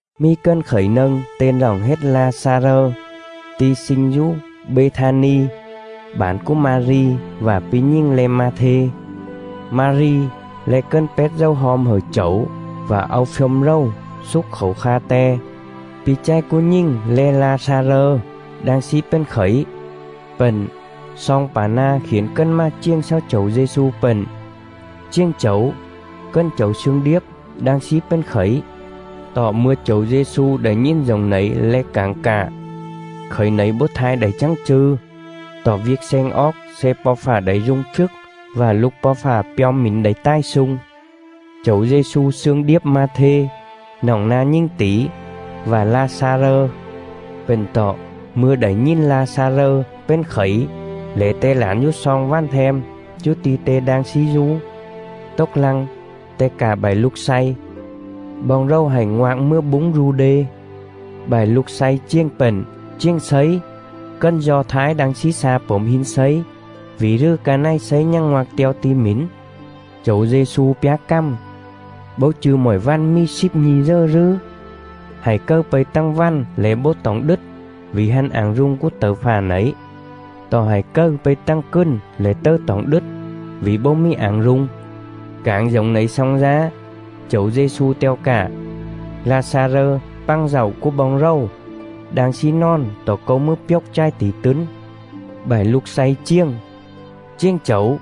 Mì cần khẩy nâng ten roọng hết La-xa-rơ, ti̱ sling dú Bê-tha-ni, bản cúa Ma-ri vạ pi̱ nhình le̱ Ma-thê.. Ma-ri le̱ cần pét dầu hom hẩư Chẩu vạ au phjôm rầu xúc khảu kha Te; pi̱ chài cúa nhình le̱ La-xa-rơ đang slí pền khẩy.. Pện, sloong pả na̱ khiển cần mà chiềng xáu Chẩu Dê-xu pện: “Chiềng Chẩu, cần Chẩu slương điếp đang slí pền khẩy.” Tọ mư̱a Chẩu Dê-xu đảy nhìn dổng nẩy lẻ cảng cạ: “Khẩy nẩy bấu thai đảy chắng chư̱, tọ viêc sleng oóc sle Po̱ Fạ đảy rung phjức vạ Lục Po̱ Fạ pjom mỉn đảy tài slung.” Chẩu Dê-xu slương điếp Ma-thê, noọng na̱ nhình tỉ, vạ La-xa-rơ. Pện tọ, mư̱a đảy nhìn La-xa-rơ pền khẩy lẻ Te lản dú sloong vằn them dú ti̱ Te đang slí dú. Tốc lăng, Te cạ bại lục slay: “Boong rầu hạy ngoạc mừa búng Du-đê.” Bại lục slay chiềng pện: “Chiềng Slấy, cần Do Thái đang slí xa pổm hin Slấy, vỉ rừ ca này Slấy nhằng ngoạc te̱o ti̱ mỉn?” Chẩu Dê-xu pjá cằm: “Bấu chư̱ mọi vằn mì slíp nhi̱ dờ rừ? Hại cầư pây tằng vằn lẻ bấu toỏng đứt, vỉ hăn ảng rung cúa tẩư fạ nẩy. Tọ hại cầư pây tằng cừn lẻ tầư toỏng đứt, vỉ bấu mì ảng rung.” Cảng dổng nẩy xong dá, Chẩu Dê-xu te̱o cạ: “La-xa-rơ, pằng dạu cúa boong rầu, đang slí nòn tọ Câu mừa pjốc chài tỉ tứn.” Bại lục slay chiềng: “Chiềng Chẩu,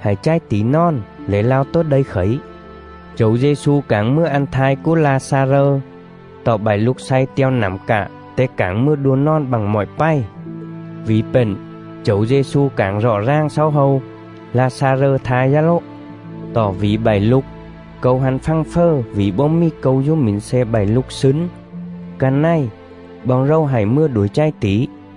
hại chài tỉ nòn lẻ lao tố đây khẩy.” Chẩu Dê-xu cảng mừa ăn thai cúa La-xa-rơ, tọ bại lục slay te̱o nẳm cạ Te cảng mừa đua nòn bặng mọi pày. Vỉ pện, Chẩu Dê-xu cảng rọ ràng xáu hâu: “La-xa-rơ thai dá lố. Tọ vỉ bại lục, Câu hăn fằng fờ vỉ bấu mì Câu dú mỉn sle bại lục slứn. Ca này, boong rầu hạy mừa đuổi chài tỉ.”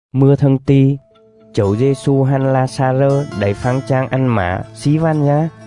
Mư̱a thâng ti̱, Chẩu Dê-xu hăn La-xa-rơ đảy phăng chang ăn mả slí vằn dá.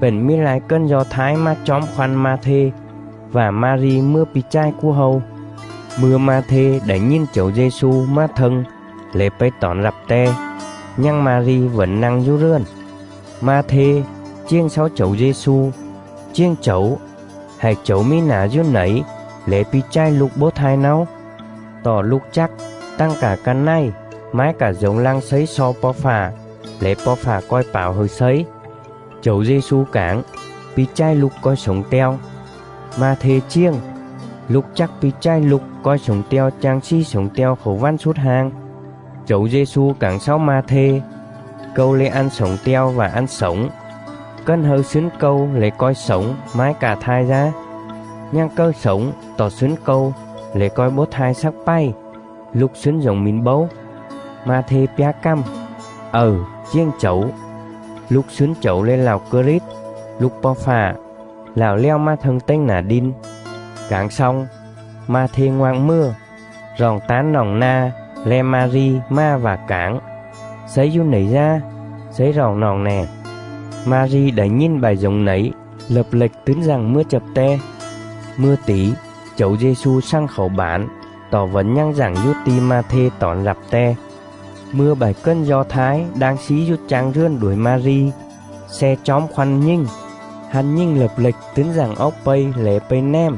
pện mì lai cần Do Thái mà chóm khoăn Ma-thê vạ Ma-ri mừa pi̱ chài cúa hâu. Mư̱a Ma-thê đảy nhìn Chẩu Dê-xu mà thâng lẻ pây tỏn rặp Te, nhằng Ma-ri vẩn nă̱ng dú rườn. Ma-thê chiềng xáu Chẩu Dê-xu: “Chiềng Chẩu, hại Chẩu mì nả dú nẩy lẻ pi̱ chài lục bấu thai náo. Tọ lục chắc, tằng cạ ca này, mái cạ dổng lăng Slấy xo Po̱ Fạ lẻ Po̱ Fạ co̱i pảo hẩư Slấy.” Chẩu Dê-xu cảng: “Pi̱ chài lục co̱i slổng te̱o.” Ma-thê chiềng: “Lục chắc pi̱ chài lục co̱i slổng te̱o chang slì slổng te̱o khảu vằn slút hang.” Chẩu Dê-xu cảng xáu Ma-thê: “Câu le̱ ăn slổng te̱o vạ ăn slổng. Cần hâư slứn Câu lẻ co̱i slổng, mái cạ thai dá. Nhằng cầư slổng tọ slứn Câu lẻ co̱i bấu thai slắc pày. Lục slứn dổng mỉn bấu?” Ma-thê pjá cằm: “Ầư, chiềng Chẩu, lục slứn Chẩu le̱ Lạo Krit, Lục Po̱ Fạ, Lạo lèo mà thâng tềnh nả đin.” Cảng xong, Ma-thê ngoạc mừa, roọng tán noọng na̱ le̱ Ma-ri mà vạ cảng: “Slấy dú nẩy dá, Slấy roọng noọng nè.” Ma-ri đảy nhìn bại dổng nẩy lập lệch tứn dặng mừa chập Te. Mư̱a tỉ, Chẩu Dê-xu xằng khảu bản tọ vẩn nhằng dặng dú ti̱ Ma-thê tỏn rặp Te. Mư̱a bại cần Do Thái đang slí dú chang rườn đuổi Ma-ri, sle chóm khoăn nhình, hăn nhình lập lệch tứn dặng oóc pây lẻ pây nèm,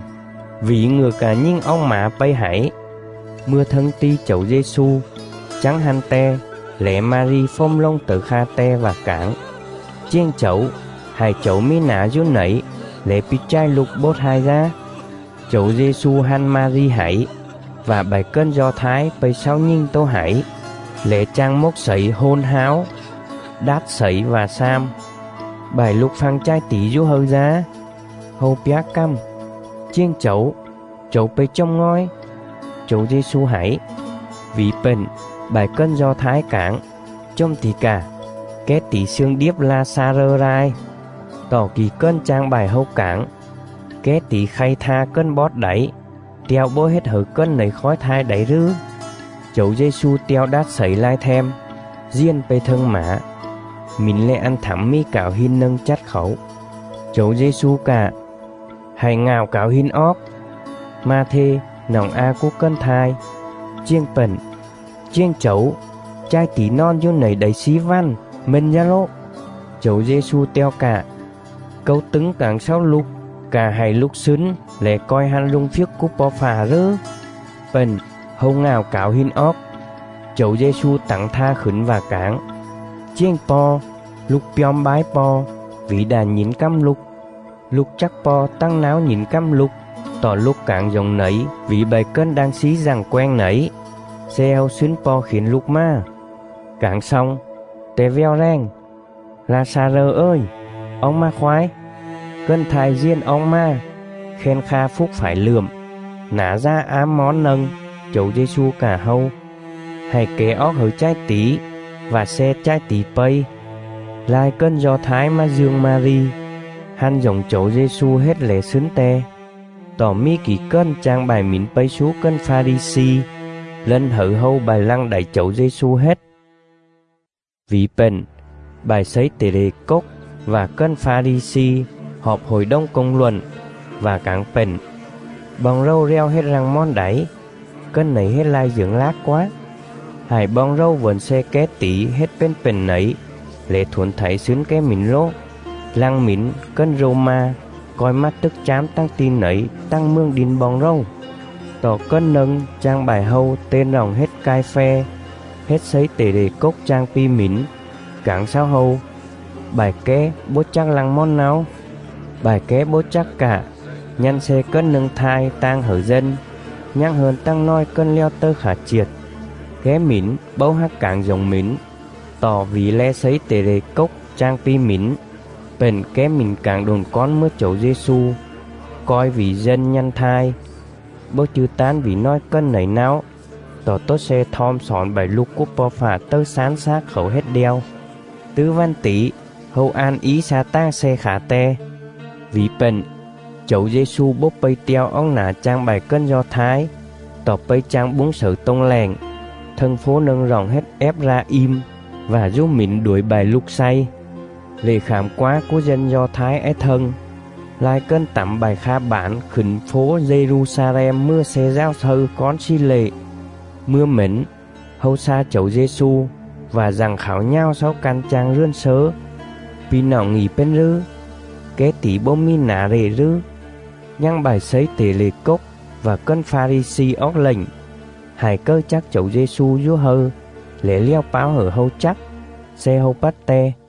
vỉ ngựa cạ nhình oóc mả pây hảy. Mư̱a thâng ti̱ Chẩu Dê-xu, chắng hăn Te lẻ Ma-ri fồm lồng tẩư kha Te vạ cảng: “Chiềng Chẩu, hại Chẩu mì nả dú nẩy lẻ pi̱ chài lục bấu thai dá.” Chẩu Dê-xu hăn Ma-ri hảy, vạ bại cần Do Thái pây xáu nhình tố hảy, lẻ chang mốc slẩy hôn háo, đát slẩy vạ xam: “Bại lục phăng chài tỉ dú hâư dá?” Hâu pjá cằm: “Chiềng Chẩu, Chẩu pây chồm ngòi.” Chẩu Dê-xu hảy. Vỉ pện, bại cần Do Thái cảng: “Chồm tỉ cà, ké tỉ slương điếp La-xa-rơ lai!” Tọ kỉ cần chang bại hâu cảng: “Ké tỉ khay tha cần bót đảy, te̱o bấu hết hẩư cần nẩy khói thai đảy rừ?” Chẩu Dê-xu te̱o đát slẩy lai them, diền pây thâng mả. Mỉn le̱ ăn thẳm mì cảo hin nâng chắt khảu. Chẩu Dê-xu cạ: “Hạy ngạo cảo hin oóc.” Ma-thê, noọng a cúa cần thai, chiềng pện: “Chiềng Chẩu, chài tỉ nòn dú nẩy đảy slí vằn, mên dá lố.” Chẩu Dê-xu te̱o cạ: “Câu tứng cảng xáu lục cạ hại lục slứn lẻ co̱i hăn rung phjức cúa Po̱ Fạ rừ?” Pện, hâu ngạo cảo hin oóc. Chẩu Dê-xu tẳng tha khửn vạ cảng: “Chiềng Po̱, Lục pjom bái Po̱, vỉ đạ nhỉn cằm Lục. Lục chắc Po̱ tằng náo nhỉn cằm Lục, tọ Lục cảng dổng nẩy vỉ bại cần đang slí dặng quenh nẩy, sle hâu slứn Po̱ khiển Lục mà.” Cảng xong, Te vèo rèng: “La-xa-rơ ời, oóc mà khoái!” Cần thai diền oóc mà, khen kha phúc phải lượm, nả dà ám món nâng. Chẩu Dê-xu cạ hâu: “Hạy kẻ oóc hẩư chài tỉ, vạ sle chài tỉ pây.” Lai cần Do Thái mà dương Ma-ri, hăn dổng Chẩu Dê-xu hết lẻ slứn Te. Tọ mì kỉ cần chang bại mỉn pây slú cần Pha-ri-xi, lân hẩư hâu bại lăng đảy Chẩu Dê-xu hết. Vỉ pện, bại slấy tể lệ cốc vạ cần Pha-ri-xi họp Hội đồng Công luận, vạ cảng pện: “Boong rầu lèo hết lăng mòn đảy? Cần nẩy hết lai dưởng lác quá. Hại boong rầu vẩn sle ké tỉ hết pền pện nẩy, lẻ thuổn thảy slứn ké mỉn lố, lăng mỉn cần Rô-ma co̱i mà tức chám tằng ti̱ nẩy tằng mường đin boong rầu.” Tọ cần nâng chang bại hâu ten roọng hết Cai-phe, hết slấy tể lệ cốc chang pi mỉn, cảng xáu hâu: “Bại ké bố chắc lăng mòn náo! Bại ké bấu chắc cạ, nhă̱n sle cần nâng thai tang hẩư dân, nhằng hơn tằng nòi cần lèo tầư khả chiệt.” Ké mỉn bấu hác cảng dổng mỉn, tọ vỉ le̱ slấy tể lệ cốc chang pi mỉn, pện ké mỉn cảng độn cón mừa Chẩu Dê-xu co̱i vỉ dân nhă̱n thai, bấu chư̱ tán vỉ nòi cần nẩy náo, tọ tố sle thom xỏn bại lục cúa Po̱ Fạ tầư slán slác khảu hết đeo. Tứ vằn tỉ, hâu an í xa tàng sle khả Te. Vỉ pện, Chẩu Dê-xu bấu pây te̱o oóc nả chang bại cần Do Thái, tọ pây chang búng xẩư tô̱ng lẹng, thâng fố nâng roọng hết Ép-ra-im vạ dú mỉn đuổi bại lục slay. Lệ Khảm Quá cúa dân Do Thái ái thâng, lai cần tẳm bại kha bản khửn fố Dê-ru-xa-lem mừa sle dào slâư cón slì lệ. Mư̱a mển, hâu xa Chẩu Dê-xu vạ dặng khảo nhào xáu căn chang rườn slớ: “Pi̱ noọng ngị pền rừ? Ké tỉ bấu mì nả lệ rừ?” Nhằng bại slấy tể lệ cốc vạ cần Pha-ri-xi oóc lệnh: hại cầư chắc Chẩu Dê-xu dú hâư lẻ lèo páo hẩư hâu chắc, sle hâu pắt Te.